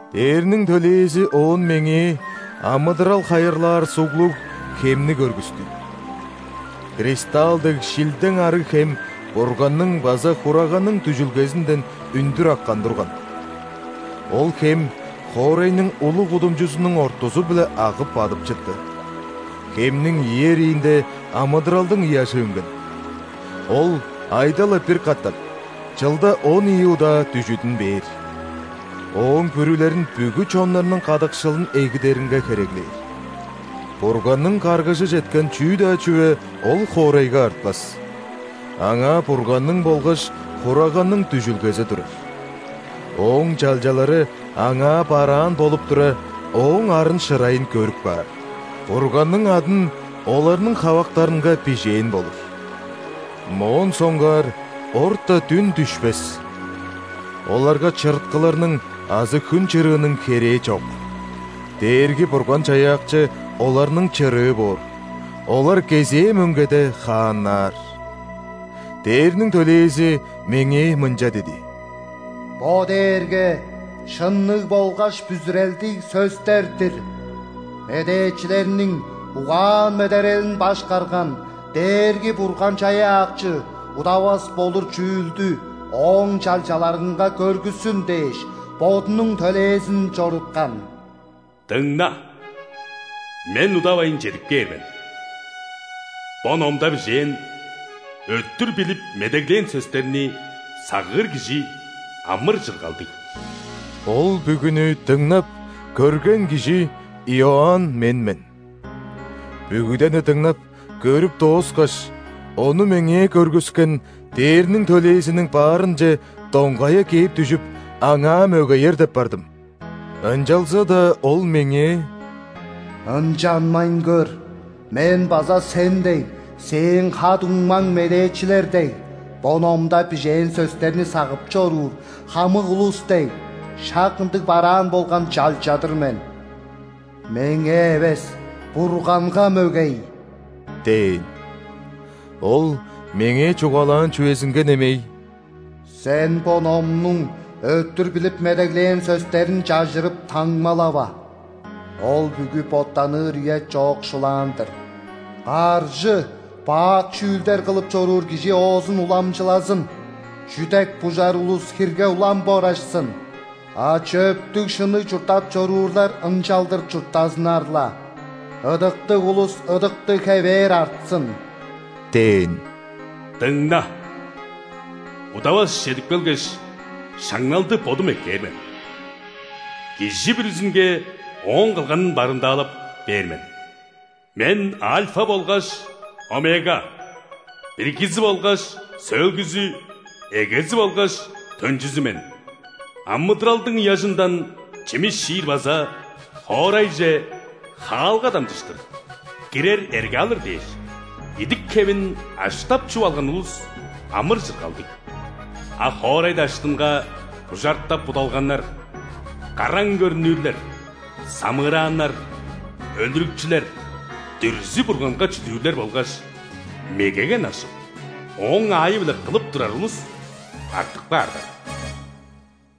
Дээрниң төлээзи оон меңээ амыдырал хайырлаар суглуг хемни көргүстү. Кристалл дег шилдең арыг хем Бурганның база Хураганның дүжүлгезинден үндүр аккан турган. Ол хем хоорайның улуг кудумчузунуң ортузу-биле агып бадып чытты. Хемниң ийи эриинде амыдыралдың ыяжы үнген. Ол айда-ла бир катап, чылда он ийи удаа дүжүдүн бээр. Ооң бүрүлерин бүгү чоннарның кадыкшылын эгидеринге хереглээр. Бурганның каргыжы четкен чүү-даа чүве ол хоорайга артпас. Аңаа Бурганның болгаш Хураганның дүжүлгези турар. Ооң чалчалары Аңаа бараан болуп тура, Ооң арын-шырайын көрүп каар, Бурганның адын оларның хавактарынга бижээн болур. Моон соңгаар орта дүн дүшпес. Оларга чырыткыларның азы хүн чырыының херээ чок, Дээрги-Бурган-Чаяакчы оларның чырыы боор, олар кезээ мөңгеде хааннаар. Дээрниң төлээзи меңээ мынча диди: «Бо дээрге шынныг болгаш бүзүрелдиг сөстер-дир. Медээчилерниң угаан-медерелин башкарган Дээрги-Бурган-Чаяакчы удавас болур чүүлдү Ооң чалчаларынга көргүссүн дээш, Бодунуң төлээзин чоруткан». «Дыңна, Мен удавайн чедип кээр мен! Бо номда бижээн, өттүр билип медеглээн сөстерни сагыыр кижи амыр-чыргалдыг». Ол бүгүнү дыңнап, көрген кижи – Иоанн мен мен. Бүгүдени дыңнап, көрүп дооскаш, ону меңээ көргүскен ·дээрниң төлээзиниң баарынче доңгая кээп дүжүп, аңаа мөгеер деп бардым. Ынчалза-даа ол меңээ: «Ынчанмайн көр. Мен база сен дег, сээң ха-дуңмаң медээчилер дег, бо номда бижээн сөстерни сагып чоруур хамык улус дег, шак ындыг бараан болган чалча-дыр мен. Меңээ эвес, Бурганга мөгей!» – дээн. Ол меңээ чугаалаан чүвезинге немей: «Сен бо номнуң өттүр билип медеглээн сөстерин чажырып, таңмалава. Ол бүгү боттаныр үе чоокшулаан-дыр. Каржы, бак чүүлдер кылып чоруур кижи оозун уламчылазын, чүдек-бужар улус хирге улам борашсын. А чөптүг-шынныг чурттап чоруурлар ынчалдыр чурттазыннар-ла. Ыдыктыг улус ыдыктыг хевээр артсын» – дээн. «Дыңна! Удавас чедип келгеш, шаңналды Бодум эккээр мен. Кижи бүрүзүнге ооң кылганын барымдаалап бээр мен. Мен Альфа болгаш Омега, биргизи болгаш сөөлгүзү, эгези болгаш төнчүзү мен. Амыдыралдың ыяжындан чимис чиир база хоорайже хаалга дамчыштыр кирер эрге алыр дээш, идик-хевин аштап-чуп алган улус амыр-чыргалдыг. А хоорай даштынга бужартап будалганнар, караң көрнүрлер, самыырааннар, өлүрүкчүлер, дүрзү-бурганга чүдүүрлер болгаш мегеге ынакшып, ооң аайы-биле кылып турар улус артып каарлар.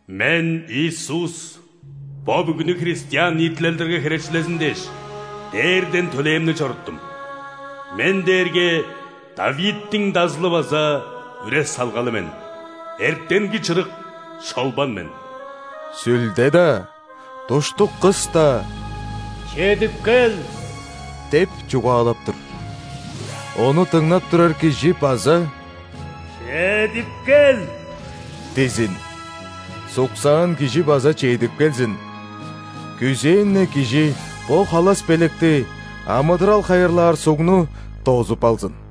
Мен, Иисус, бо бүгүнү христиан ниитилелдерге херечилезин дээш, дээрден төлээмни чоруттум. Мен дээрге ·Давидтиң Дазылы база үре-салгалы мен, эртенги чырык шолбан мен. Сүлде-даа, душтук кыс-даа: „Чедип кел!“ – деп чугаалап тур. Ону дыңнап турар кижи база: „Чедип кел!“ – дизин. Суксаан кижи база чедип келзин. Күзээн-не кижи бо халас белекти – амыдырал хайырлаар сугну дозуп алзын».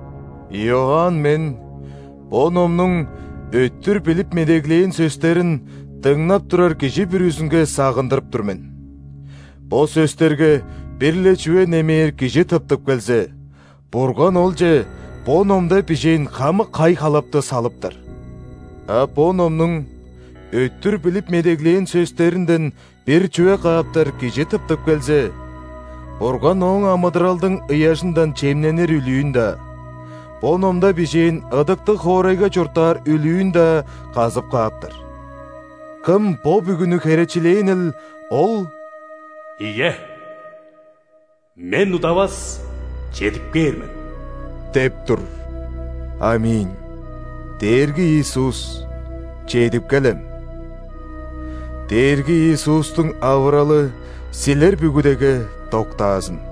Иоанн мен бо номнуң өттүр билип медеглээн сөстерин дыңнап турар кижи бүрүзүнге сагындырып тур мен: бо сөстерге бир-ле чүве немээр кижи тыптып келзе, Бурган олче бо номда бижээн хамык хай-халапты салыптар. А бо номнуң өттүр билип медеглээн сөстеринден бир чүве кааптар кижи тыптып келзе, Бурган ооң амыдыралдың ыяжындан чемненир үлүүн-даа, бо номда бижээн ыдыктыг хоорайга чурттаар үлүүн-даа казып кааптар. Кым бо бүгүнү херечилээнил, Ол: «Ийе, Мен удавас чедип кээр мен» – деп тур. ·Аминь! Дээрги Иисус, чедип келем! Дээрги Иисустуң авыралы силер бүгүдеге доктаазын.